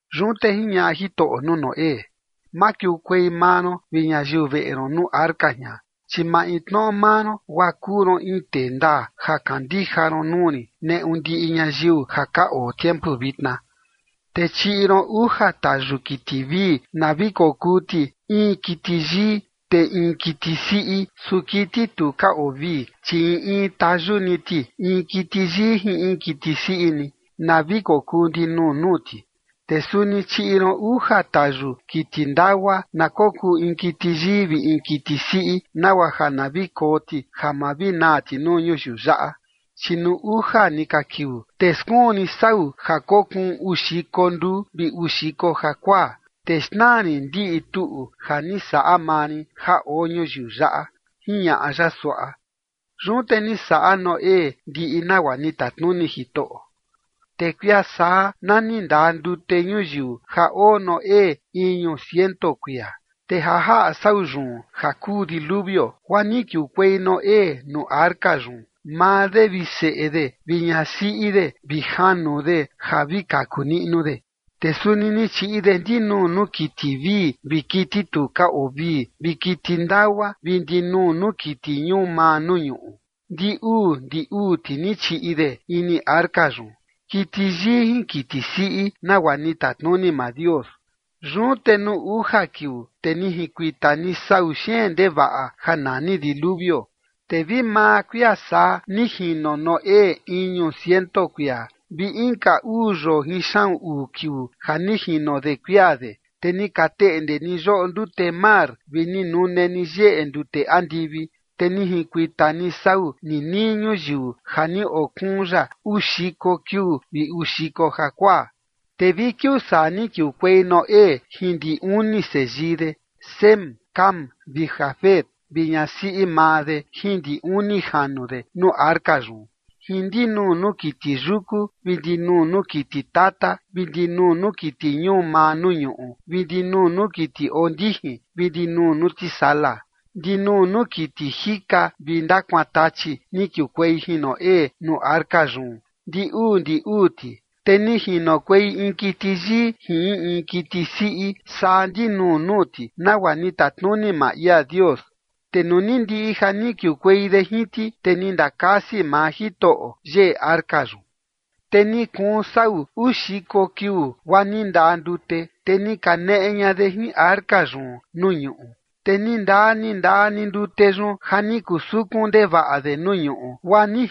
Yun te jiñaꞌa Jitoꞌo nuu Noé: ―Makiukuei maa ron vi ñayiu veꞌe ron nuu arca jian, chi maintnoꞌo maa ron guaa kuu ron in tee ndaa ja kandija ron nuu rin neꞌu ndiꞌi ñayiu ja ka oo tiempu vitna. Te chiꞌi ron uja tayu kiti vii na vi kokuu ti in kiti yii, te in kiti siꞌi. Su kiti tu ka oo vii, chi in in tayu ni ti in kiti yii jin in kiti siꞌi ni, na vi kokuu ndinuu nuu ti. Te suni chiꞌi ron uja tayu kiti ndagua na kokuu in kiti yii vi in kiti siꞌi, nagua ja na vi koo ti ja ma vi naa ti nuu ñuyiu yaꞌa. Chi nuu uja ni ka kiuu te skuun rin sau ja kokuun uu xiko nduu vi uu xiko jakuaa, te xnaa rin ndiꞌi tuꞌu ja ni saꞌa maa rin ja oo ñuyiu yaꞌa ―jiñaꞌa ya suaꞌa. Yun te ni saꞌa Noé ndiꞌi nagua ni tatnuni Jitoꞌo. Te kuia saa na ni ndaa ndute ñuyiu ja oo Noé iñu ciento kuia. Te ja jaꞌa sau yun ja kuu diluvio guaa ni kiukuei Noé nuu arca yun, maa de vi seꞌe de vi ñasiꞌi de vi janu de ja vi kaku niꞌnu de. Te suni ni chiꞌi de ndinuu nuu kiti vii vi kiti tu ka oo vii vi kiti ndagua vi ndinuu nuu kiti ñuu maa nuu ñuꞌu. Ndi uu ndi uu ti ni chiꞌi de ini arca yun, kiti yii jin kiti siꞌi nagua ni tatnuni maa Dios. Yun te nuu uja kiuu, te ni jinkuita ni sau xeen ndevaꞌa ja nani diluvio. Te vi maa kuia saa ni jino Noé iñu ciento kuia vi inka uu yoo jin xaꞌun uu kiuu ja ni jino de kuia de, te ni ka teꞌnde ni yoꞌo ndute mar vi ni nune ni yeꞌe ndute andivi. Te ni jinkuita ni sau nii nii ñuyiu ja ni okuun ya uu xiko kiuu vi uu xiko jakuaa. Te vi kiuu saa ni kiukuei Noé jin ndi uni seyii de, Sem, Cam vi Jafet vi ñasiꞌi maa de jin ndi uni janu de nuu arca yun, jin ndinuu nuu kiti yuku vi ndinuu nuu kiti tata vi ndinuu nuu kiti ñuu maa nuu ñuꞌu vi ndinuu nuu kiti oo ndijin vi ndinuu nuu tisala. Ndinuu nuu kiti jika vi ndakuantachi ni kiukuei jin Noé nuu arca yun ndi uu ndi uu ti. Te ni jinokuei in kiti yii jin in in kiti siꞌi saa ndinuu nuu ti nagua ni tatnuni maa ia Dios. Te nuu ni ndiꞌi ja ni kiukuei de jin ti, te ni ndakasi maa Jitoꞌo yeꞌe arca yun. Te ni kuun sau uu xiko kiuu, guaa ni ndaa ndute, te ni kaneꞌe ña de jin arca yun nuu ñuꞌu. Te ni ndaa ni ndaa ni ndute yun ja ni kuu sukun ndevaꞌa de nuu ñuꞌu, guaa ni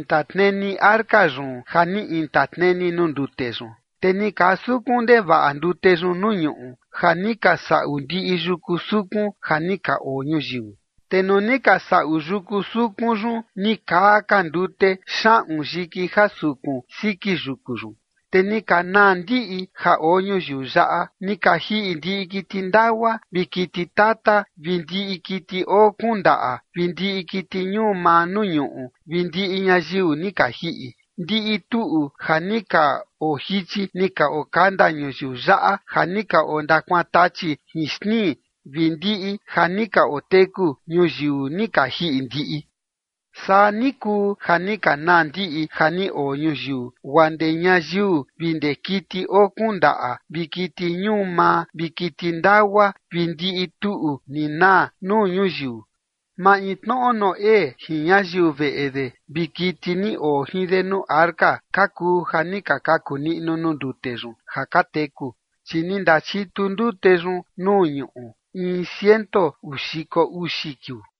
jinkuintatneni arca yun ja ni intatneni nuu ndute yun. Te ni kaa sukun ndevaꞌa ndute yun nuu ñuꞌu ja ni ka saꞌu ndiꞌi yuku sukun ja ni ka oo ñuyiu. Te nuu ni ka saꞌu yuku sukun yun ni kaa ka ndute xaꞌun yiki ja sukun siki yuku yun. Te ni ka naa ndiꞌi ja oo ñuyiu yaꞌa ni ka jiꞌi ndiꞌi kiti ndagua vi kiti tata vi ndiꞌi kiti oo kuun ndaꞌa vi ndiꞌi kiti ñuu maa nuu ñuꞌu vi ndiꞌi ñayiu ni ka jiꞌi. Ndiꞌi tuꞌu ja ni ka ojichi ni ka okanda ñuyiu yaꞌa ja ni ka ondakuantachi jin xtnii vi ndiꞌi ja ni ka oteku ñuyiu ni ka jiꞌi ndiꞌi. Saa ni kuu ja ni ka naa ndiꞌi ja ni oo ñuyiu guaa ndee ñayiu vi ndee kiti oo kuun ndaꞌa vi kiti ñuu maa vi kiti ndagua vi ndiꞌi tuꞌu ni naa nuu ñuyiu. Maintnoꞌo Noé jin ñayiu veꞌe de vi kiti ni oo jin de nuu arca ka kuu ja ni ka kaku niꞌnu nuu ndute yun ja ka teku, chi ni ndachitu ndute yun nuu ñuꞌu in ciento uu xiko uxi kiuu.